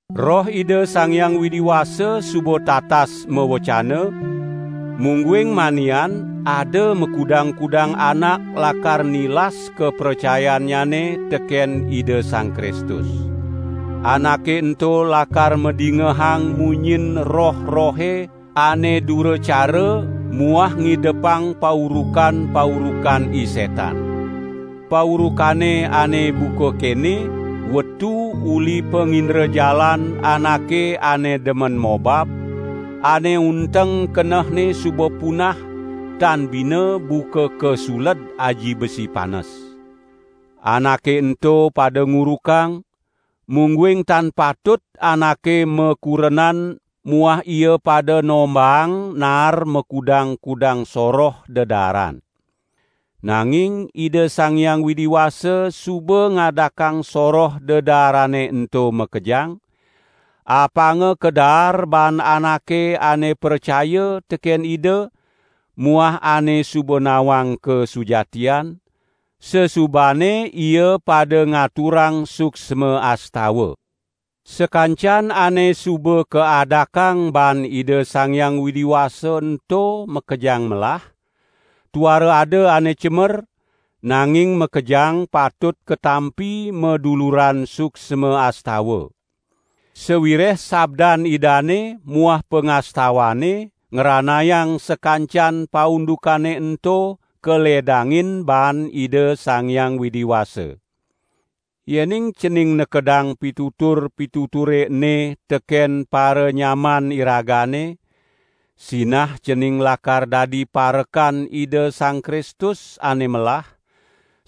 Roh Ida Sang Hyang Widi Wasa suba tatas mawecana, mungguing manian ada makudang-kudang anak lakar nilas kapracayannyane teken Ida Sang Kristus. Anake ento lakar madingehang munyin roh-rohe ane duracara muah ngidepang paurukan-paurukan I Setan. Paurukane ane buka kene wetu uli pangindrajalan anake ane demen mobab, ane unteng kenehne suba punah, tan bina buka kasuled aji besi panes. Anake ento pada ngurukang, mungguing tan patut anake makurenan muah ia pada nombahang naar makudang-kudang soroh dedaaran. Nanging Ida Sang Hyang Widi Wasa suba ngadakang soroh dedaarane ento makejang, apanga kadaar baan anake ane pracaya teken Ida muah ane suba nawang kasujatian, sasubane ia pada ngaturang suksma astawa. Sakancan ane suba kaadakang baan Ida Sang Hyang Widi Wasa ento makejang melah, tuara ada ane cemer, nanging makejang patut katampi maduluran suksma astawa. Sawireh sabdan Idane muah pangastawane ngranayang sakancan paundukane ento kaledangin baan Ida Sang Hyang Widi Wasa. Yening cening nekedang pitutur-pituture ene teken paranyaman iragane, sinah cening lakar dadi parekan Ida Sang Kristus ane melah,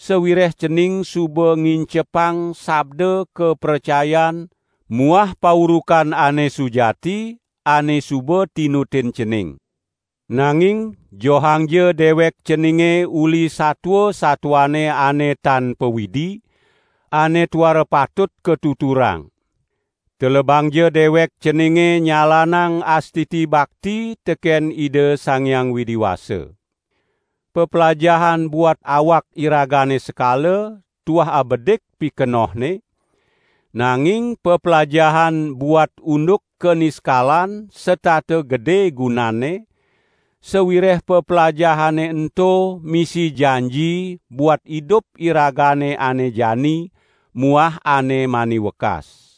sawireh cening suba ngincepang sabda kapracayan muah paurukan ane sujati, ane suba tinutin cening. Nanging johangja dewek ceninge uli satua-satuane ane tan pawidi, ane tuara patut katuturang. Telebangja dewek ceninge nyalanang astiti bakti teken Ida Sang Hyang Widi Wasa. Peplajahan buat awak iragane sekala, tuah abedik pikenohne, nanging peplajahan buat unduk kaniskalan setata gede gunanne, sawireh peplajahane ento misi janji buat idup iragane ane jani muah ane mani wekas.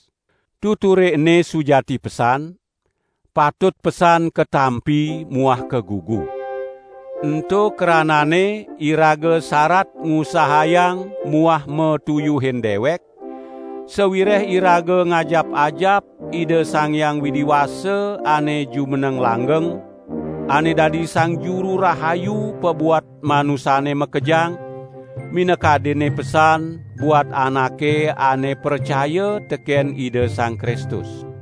Tuture ene sujati pesan, patut pesan katampi muah kagugu. Ento krananne iraga sarat ngusahayang muah matuyuhin dewek, sawireh iraga ngajap-ajap Ida Sang Hyang Widi Wasa ane jumeneng langgeng, ane dadi Sang Juru Rahayu pabuat manusane makejang, minakadinne pesan buat anake ane pracaya teken Ida Sang Kristus.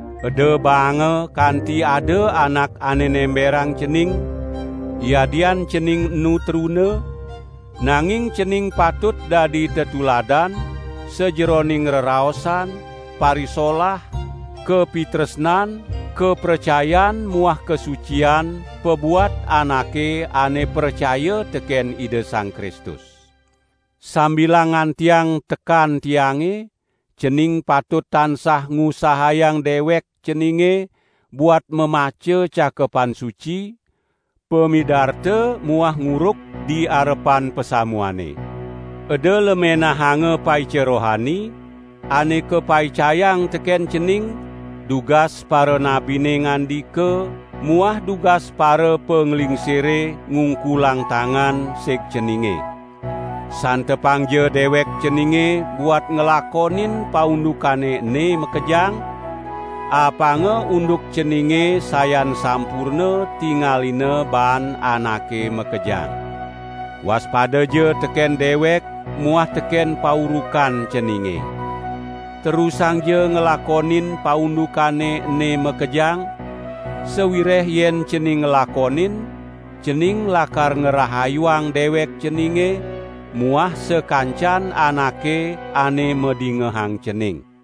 Eda baanga kanti ada anak ane nemberang cening, yadian cening enu truna, nanging cening patut dadi tetuladan, sajeroning reraosan, parisolah, kapitresnan, kapracayan muah kasucian pabuat anake ane pracaya teken Ida Sang Kristus. Sambilang ngantiang tekan tiange, cening patut tansah ngusahayang dewek ceninge buat mamaca Cakepan Suci, pamidarta muah nguruk di arepan pasamuane. Eda lemenahanga paica rohani, ane kapaicayang teken cening, dugas paranabine ngandika muah dugas parapanglingsire ngungkulang tangan sig ceninge. Santepangja dewek ceninge buat nglakonin paundukane ene makejang, apanga unduk ceninge sayan sampurna tingalina baan anake makejang. Waspadaja teken dewek muah teken paurukan ceninge. Terusangja nglakonin paundukane ene makejang, sawireh yen cening nglakonin, cening lakar ngrahayuang dewek ceninge muah sakancan anake ane madingehang cening.